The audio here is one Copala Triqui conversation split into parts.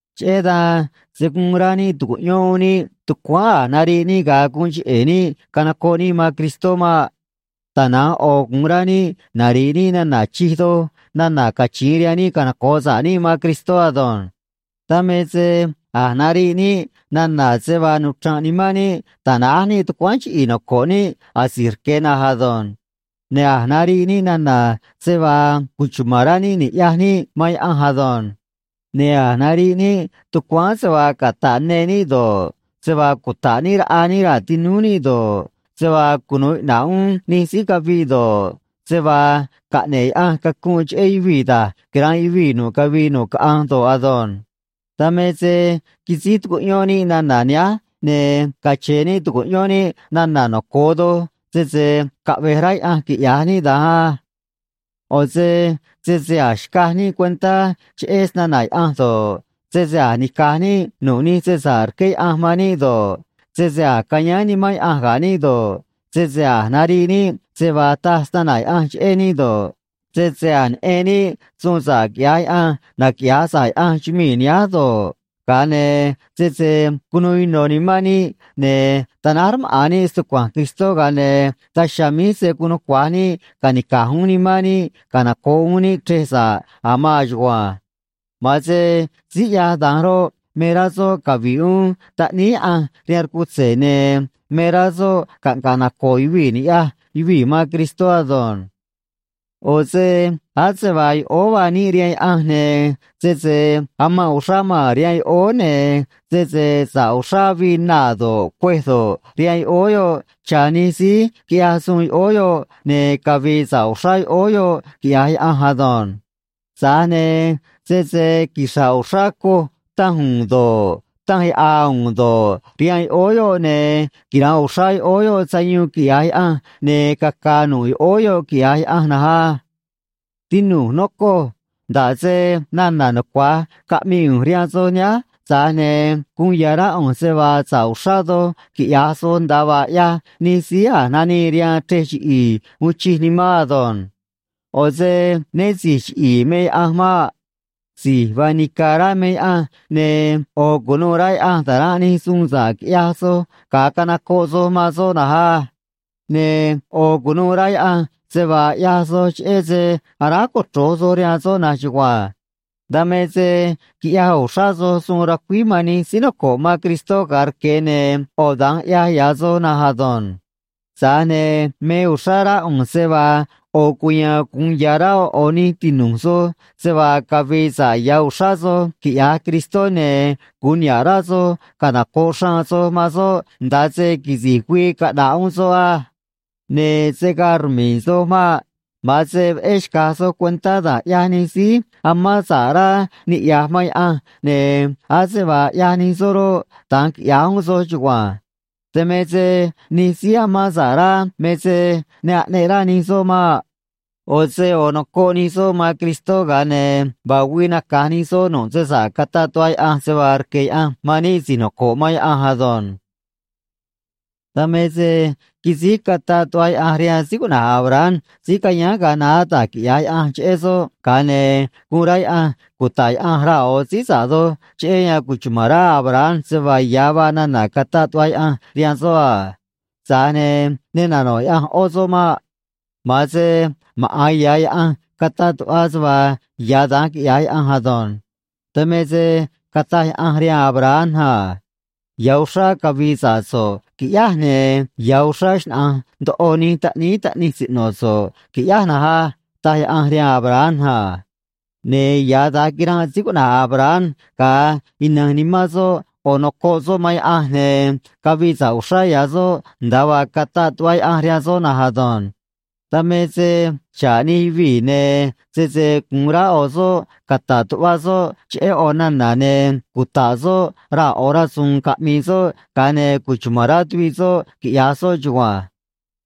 Cheꞌé dan se̱ guun rá níꞌ tu̱cuꞌyón uún níꞌ tucuáán a̱j nariꞌ níꞌ ga̱a guun cheꞌe̱ níꞌ canocoꞌ níꞌ man Cristó maꞌ. Tana̱nj ꞌo̱ gu̱un rá níꞌ nari̱ꞌ níꞌ nana̱ chij doj nana̱ cachi̱in rihaan níꞌ canoco̱ꞌ sa̱ꞌ níꞌ man Cristó ado̱nj. Dan me se a̱j nariꞌ níꞌ nana̱ se vaa nuchra̱nꞌ nimán níꞌ ta̱náj níꞌ tucuáán chiꞌi̱i̱ noco̱ꞌ níꞌ asi̱j rque̱ na̱nj ado̱nj. Ne̱ a̱j nariꞌ níꞌ nana̱ se vaa cuchuma̱n rá níꞌ ni̱ꞌyaj níꞌ man Yaꞌanj ado̱nj. Ne̱ a̱j nariꞌ níꞌ tucuáán se vaa cata̱ꞌ ne níꞌ do̱ꞌ, se vaa cuta̱ꞌ níꞌ raꞌa níꞌ raa̱ tinúú níꞌ do̱ꞌ, se vaa cunu̱u iꞌna̱ꞌ uún nij síí caviꞌ do̱ꞌ, se vaa caꞌne̱ꞌ Yaꞌanj cacunꞌ cheꞌé yuvii̱ da̱j quira̱nꞌ yuvii̱ nu̱ꞌ cavii nu̱ꞌ caꞌanj do̱ꞌ ado̱nj. Dan me se quisíj tucuꞌyón níꞌ nana̱ nihánj, ne̱ cache̱n níꞌ tu̱cuꞌyón níꞌ nana̱ noco̱o doj, sese caꞌve̱j rá Yaꞌanj quiꞌya̱j níꞌ da̱nj á. ꞌO̱ se sese a̱j xcaj níꞌ cuentá cheꞌé snana̱ Yaꞌanj do̱ꞌ, sese a̱j nica̱j níꞌ nu̱ꞌ nij se sa̱ꞌ rqué Yaꞌanj rihaan níꞌ do̱ꞌ, sese a̱j cayáán Nimán Yaꞌanj ga̱ níꞌ do̱ꞌ, sese a̱j nariꞌ níꞌ se vaa taj snana̱ Yaꞌanj cheꞌé níꞌ do̱ꞌ, sese a̱j neꞌen níꞌ suun sa̱ꞌ quiꞌya̱j Yaꞌanj naquiꞌya̱j sa̱ꞌ Yaꞌanj chumii̱ nihánj do̱ꞌ, ga̱a ne̱ sese cunu̱u ino̱ nimán níꞌ ne̱ ta̱náj rmaꞌa̱n níꞌ stucua̱nj Cristó, ga̱a ne̱ daj chiha̱a̱ míj se̱ guun nucua̱j níꞌ ca̱nica̱j uún nimán níꞌ canoco̱ꞌ uún níꞌ chrej sa̱ꞌ a̱ maan chugua̱nj. Ma̱an se síí ꞌyaj da̱nj roꞌ, me rá soꞌ cavi̱ꞌ uún Taꞌníí Yaꞌanj rihaan rcutze̱, ne̱ me rá soꞌ caꞌnga̱ꞌ naco̱o̱ yuvii̱ ni̱ꞌyaj yuvii̱ man Cristó ado̱nj. ꞌO̱ se ase vaa yoꞌóó vaa níꞌ rihaan Yaꞌanj, ne̱ sese amanꞌ uxrá maa̱n rihaan yoꞌóó, ne̱ sese sa̱ꞌ uxrá avii naa̱ do̱ꞌ, cuêj do̱ꞌ, rihaan yoꞌóó yoꞌ cha̱ nij síí quiꞌyaj suun yoꞌóó yoꞌ, ne̱ cavi̱i̱ sa̱ꞌ uxrá yoꞌóó yoꞌ, quiꞌya̱j Yaꞌanj ado̱nj. Tza̱j ne̱ sese quixra̱ꞌ uxrá coj tanj u̱u̱n do̱ꞌ, tanj yaꞌa̱a u̱u̱n do̱ꞌ, rihaan yoꞌóó yoꞌ, ne̱ quira̱nꞌ uxrá yoꞌóó yoꞌ sayuun, quiꞌya̱j Yaꞌanj, ne̱ caca̱a̱ nu̱ꞌ yoꞌóó yoꞌ, quiꞌya̱j Yaꞌanj na̱nj á. Tinu̱j, nocoj, nda̱ꞌ se nana̱ nucua̱j caꞌmii ꞌu̱nj rihaan soj nihánj, tza̱j ne̱ guun ya̱ rá ꞌu̱nj se vaa sa̱ꞌ uxrá doj quiꞌya̱j soj, nda̱a vaa ꞌyaj nij síí a̱j nanii rihaan chrej chiꞌi̱i̱ uun chij nimán ado̱nj. ꞌO̱ se né si̱j chiꞌi̱i̱ me Yaꞌanj maꞌ. Si̱j vaa nica̱ rá me Yaꞌanj, ne̱ ꞌo̱ cu̱nuû rá Yaꞌanj ta̱ranꞌ nij suun sa̱ꞌ quiꞌyaj soj ga̱a canocoꞌ soj man soꞌ na̱nj á. Ne̱ ꞌo̱ cu̱nuû rá Yaꞌanj se vaa ꞌyaj soj cheꞌé se aráj cochro̱j soj rihaan soꞌ na̱nj chugua̱nj. Dan me se quiꞌyaj uxrá soj suun racuíj man nij síí noco̱ꞌ man Cristó ga̱a rque̱, ne̱ ꞌo̱ da̱nj ꞌyaj ya̱ soj na̱nj ado̱nj. Tza̱j ne̱ me uxrá rá ꞌu̱nj se vaa ꞌo̱ cuya̱a̱n gu̱un ya̱ rá ꞌo̱ ꞌo̱ nij tinu̱j soj se vaa cavi̱i̱ sa̱ꞌ ya̱ uxrá soj quiꞌya̱j Cristó, ne̱ gu̱un niha̱ꞌ rá soj canoco̱ꞌ xraan soj man soꞌ nda̱a se quisi̱j güii caꞌna̱ꞌ uún soꞌ á. Ne̱ se̱ gaa rmi̱i̱ soj maꞌ. Ma̱an se veꞌé xca̱j soj cuentá da̱j ꞌyaj nij síí amán sa̱ꞌ rá niꞌya̱j man Yaꞌanj, ne̱ ase vaa ꞌyaj nij soꞌ roꞌ, da̱nj quiꞌya̱j uún soj chugua̱nj. Dan me se nij síí amán sa̱ꞌ rá me se ne aꞌneꞌ rá nij soꞌ maꞌ. ꞌO̱ se ꞌo̱ nocoꞌ nij soꞌ man Cristó, ga̱a ne̱ vaa güii naca̱j nij soꞌ nu̱ꞌ se sa̱ꞌ cataꞌ tuꞌva Yaꞌanj se vaa rque̱ Yaꞌanj man níꞌ si̱j noco̱ꞌ man Yaꞌanj ado̱nj. Dan me se quisíj cataꞌ tuꞌva Yaꞌanj rihaan síí cuꞌna̱j Abraham, síí cayáán ga̱a naá, da̱j quiꞌya̱j Yaꞌanj cheꞌé soꞌ, ga̱a ne̱ guun rá Yaꞌanj cuta̱ꞌ Yaꞌanj raa̱ ꞌo̱ síí sa̱ꞌ doj, cheꞌé yan cuchuma̱n rá Abraham se vaa ya̱ vaa nana̱ cataꞌ tuꞌva Yaꞌanj rihaan soꞌ a. Tza̱j ne̱ ne nano̱ꞌ Yaꞌanj ꞌó soꞌ maꞌ. Ma̱an se maꞌa̱n ya̱ Yaꞌanj cataꞌ tuꞌva se vaa ya̱ da̱nj quiꞌya̱j Yaꞌanj ado̱nj. Dan me se cataj Yaꞌanj rihaan Abraham a: “Ya̱ uxrá cavi̱i̱ sa̱ꞌ so̱ꞌ, qui̱ꞌyáj, ne̱ ya̱ uxrá xnaꞌa̱nj ndoꞌo nij taꞌníí taꞌnij siꞌno̱ so̱ꞌ, qui̱ꞌyáj na̱nj á”, taj Yaꞌanj rihaan Abraham a. Ne̱ ya̱ da̱nj quiranꞌ síí cuꞌna̱j Abraham, gaa ina̱j nimán soꞌ, ꞌo̱ nocoꞌ soꞌ man Yaꞌanj, ne̱ cavii sa̱ꞌ uxrá ya̱ soꞌ, nda̱a vaa cataꞌ tuꞌva Yaꞌanj rihaan soꞌ na̱nj ado̱nj. Dan me se xa̱ꞌ nij yuvii̱, ne̱ sese gu̱un rá ꞌo̱ soꞌ cata̱ꞌ tuꞌvaꞌ soꞌ cheꞌé ꞌo̱ nana̱, ne̱ cuta̱ꞌ soꞌ raa̱ ꞌo̱ rasu̱u̱n caꞌmi̱i̱ soꞌ, ga̱a ne̱ cuchuma̱n rá tuviꞌ soꞌ, quiꞌya̱j soꞌ chugua̱nj.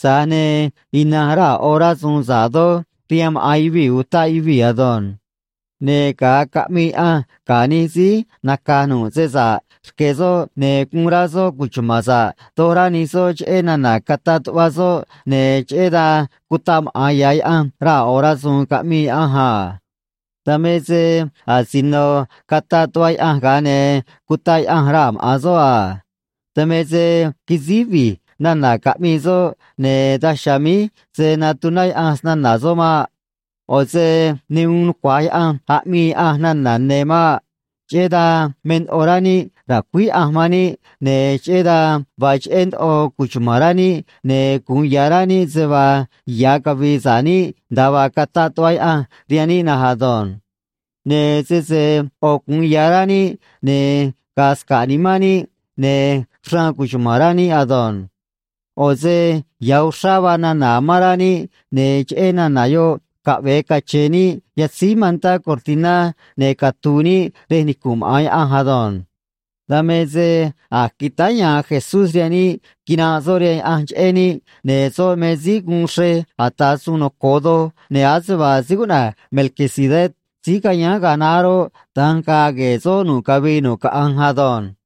Tza̱j ne̱ ina̱nj raa̱ ꞌo̱ rasu̱u̱n sa̱ꞌ doj rihaan maꞌa̱n yuvii̱ utaꞌ yuvii̱ ado̱nj. Ne̱ ga̱a caꞌmii Yaꞌanj ga̱ nij síí naca̱j nu̱ꞌ se sa̱ꞌ rque̱ soꞌ, ne̱ guun rá soꞌ cuchuma̱n sa̱ꞌ doj rá nij soꞌ cheꞌé nana̱ cataꞌ tuꞌva soꞌ, ne̱ cheꞌé dan cutaꞌ maꞌa̱n ya̱ Yaꞌanj raa̱ ꞌo̱ rasu̱u̱n, caꞌmii Yaꞌanj a. Dan me se asino cataꞌ tuꞌva Yaꞌanj, ga̱a ne̱ cutaꞌ Yaꞌanj raa̱ maꞌa̱n soꞌ a. Dan me se quisíj vi̱j nana̱ caꞌmii soꞌ, ne̱ daj chiha̱a̱ míj se̱ natuná Yaꞌanj snana̱ soꞌ maꞌ. ꞌO̱ se ne uun nucua̱j Yaꞌanj aꞌmii Yaꞌanj nana̱ ne̱ maꞌ. Cheꞌé dan me ndoꞌo rá níꞌ ra̱cuíj Yaꞌanj man níꞌ, ne̱ cheꞌé dan vaa cheꞌé ndoꞌo cuchuma̱n rá níꞌ, ne̱ gu̱un ya̱ rá níꞌ se vaa ya̱ cavi̱i̱ sa̱ꞌ níꞌ, nda̱a vaa cataꞌ tuꞌva Yaꞌanj rihaan níꞌ na̱nj ado̱nj. Ne̱ sese ꞌo̱ gu̱un ya̱ rá níꞌ, ne̱ ga̱a̱ sca̱ꞌ nimán níꞌ, ne̱ xraan cuchuma̱n rá níꞌ ado̱nj. ꞌO̱ se ya̱ uxrá vaa nana̱ amán rá níꞌ, ne̱ cheꞌé nana̱ yoꞌ caꞌve̱e cache̱n níꞌ yatzíj mantá cortiná ne̱ catu̱u̱ níꞌ rej nicu̱nꞌ maꞌa̱n Yaꞌanj ado̱nj. Dan me se a̱j quitáá ya̱a̱n Jesús rihaan níꞌ quinanꞌ soꞌ rihaan Yaꞌanj cheꞌé níꞌ, ne̱ soꞌ me síí guun xrej ata̱ suun noco̱o doj, ne̱ ase vaa síí cuꞌna̱j Melquisedec síí cayáán ga̱a naá roꞌ, da̱nj ga̱a̱ gue̱e̱ soꞌ nu̱ꞌ cavii nu̱ꞌ caꞌanj ado̱nj.